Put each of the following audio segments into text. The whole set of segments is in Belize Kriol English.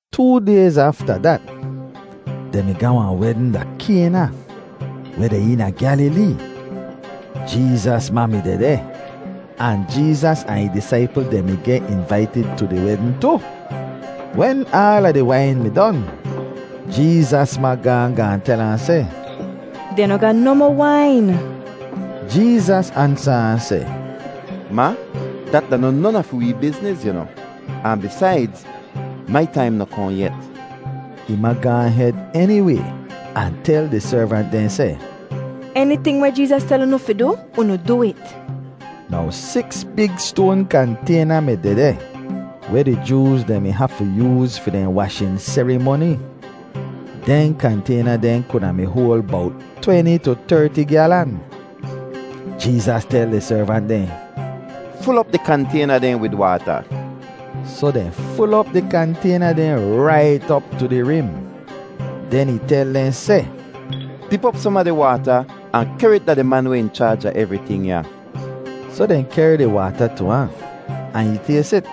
Too dayz afta dat, dehn mi ga wahn wedn da Kayna, weh deh eena Gyalilee. Jeezas ma mi dehdeh, ahn Jeezas ahn ih disaipl dehn mi geh invaitid tu di wedn tu. Wen aala di wain mi don, Jeezas ma gaahn gaahn tel ahn seh, “Dehn noh ga nohmoh wain.” Jeezas ansa ahn seh, “Ma, dat da noh non a fi wee bizniz, yu noh; ahn bisaidz, mai taim noh kohn yet.” Ih ma gaahn hed eniway ahn tel di servant dehn seh, “Eniting weh Jeezas tel unu fi du, unu du it.” Now siks big stoan kantayna mi dehdeh weh di Jooz dehn mi hafu yooz fi dehn washin serimoni. Dehn kantayna dehn kuda mi hoal bowt tweni tu terti gyalan. Jeezas tel di servant dehn, “Ful op di kantayna dehn wid waata.” Soh dehn ful op di kantayna dehn rait op tu di rim. Den ih tel dehn seh, “Dip op som a di waata ahn kehr it da di man weh in chaaj a evriting ya.” Soh dehn kehr di waata tu ahn, ahn ih tays it.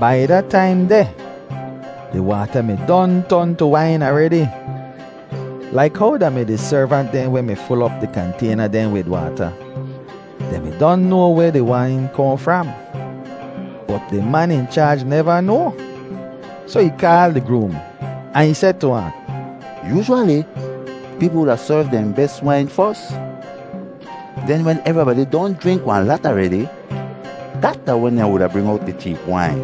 Bai da taim deh, di waata mi don ton tu wain aredi. Laik how da mi di servant dehn weh mi ful op di kantayna dehn wid waata, dehn mi don noa weh di wain kohn fram, bot di man in chaaj neva noa. Soh ih kaal di groom, ahn ih seh tu ahn, “Yoozhwali peepl wuda serv dehn bes wain fos. Den wen evribadi don jrink wahn lat aredi, dat da wen dehn wuda bring owt di cheep wain.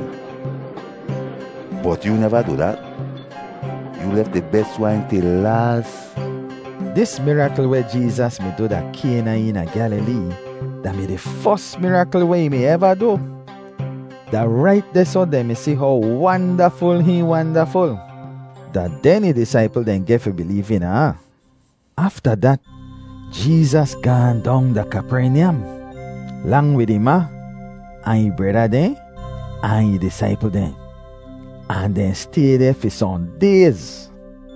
Bot yoo neva du dat. Yoo lef di bes wain til laas.” Dis mirakl weh Jeezas mi du da Kayna eena Gyalilee da-mi di fos mirakl weh ih mi eva du. Da rait dehsoh dehn mi si how wandaful hihn wandaful; da den ih disaipl dehn geh fi bileev eena ahn. Afta dat, Jeezas gaahn dong da Kapernyam, lang wid ih ma ahn ih breda dehn ahn ih disaipl dehn, ahn dehn stay deh fi sohn dayz.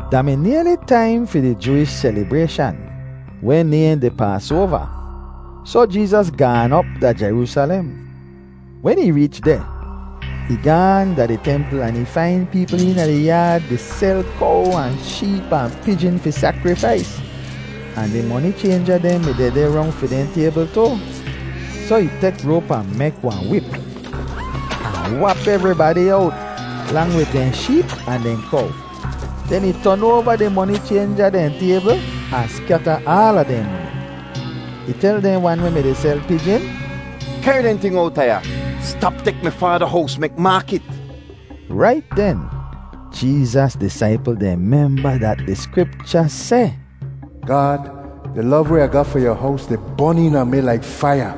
Da mi nayli taim fi di Jooish selibrayshan weh nayhn di Paasoava, soh Jeezas gaan op da Jeroosalem. Wen ih reech deh, ih gaahn da di templ ahn ih fain peepl eena di yaad di sel kow ahn sheep ahn pijin fi sakrifais, ahn di moni chaynja dehn mi dehdeh rong fi dehn taybl tu. Soh ih tek roap ahn mek wahn wip, ahn wap evribadi owt, lang wid dehn sheep ahn dehn kow; den ih ton oava di moni chaynja dehn taybl ahn skyata aala dehn moni. Ih tel dehn wan weh mi-di sel pijin, “Kehr dehn ting owta ya! Stap tek mi Faada hows mek maakit!” Rait den, Jeezas disaipl dehn memba dat di Skripcha seh, “Gaad, di lov weh Ah ga fi yu hows di bon eena mi laik faiya.”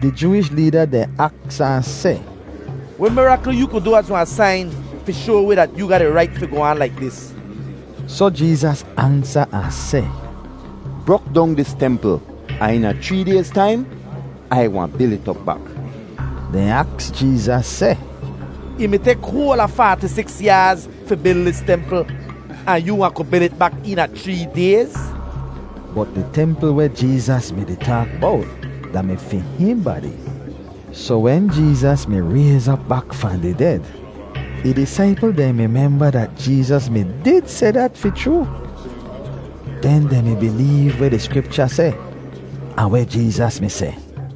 Di Jooish leeda dehn aks ahn seh, “Weh mirakl yoo ku du az wahn sain fi shoa wi dat yoo ga di rait fi goh aan laik dis?” Soh Jeezas ansa ahn seh, “Brok dong dis templ, ahn eena chree dayz taim Ai wahn bil it op bak.” Dehn aks Jeezas seh, “Ih mi tek hoal a faati siks yaaz fi bil dis templ. Ahn yoo wahn ku bil it bak eena chree dayz?” Bot di templ weh Jeezas mi-di taak bowt da-mi fi hihn badi. Soh wen Jeezas mi rayz op bak fahn di ded, ih disaipl dehn mi memba dat Jeezas mi did seh dat fi chroo. Den dehn mi bileev weh di Skripcha seh, ahn weh Jeezas mi seh.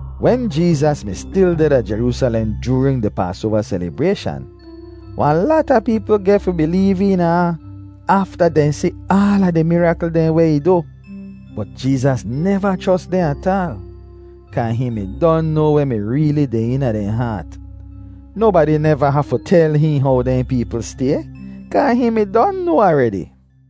Wen Jeezas mi stil deh da Jeroosalem joorin di Paasoava selibrayshan, wahn lata peepl geh fi bileev eena ahn afta dehn si aala di mirakl dehn weh ih du. Bot Jeezas neva chros dehn ataal, kaa hihn mi don noa weh mi reeli deh eena dehn haat. Nobadi neva hafu tel hihn how dehn peepl stay, kaa hihn mi don noa aredi.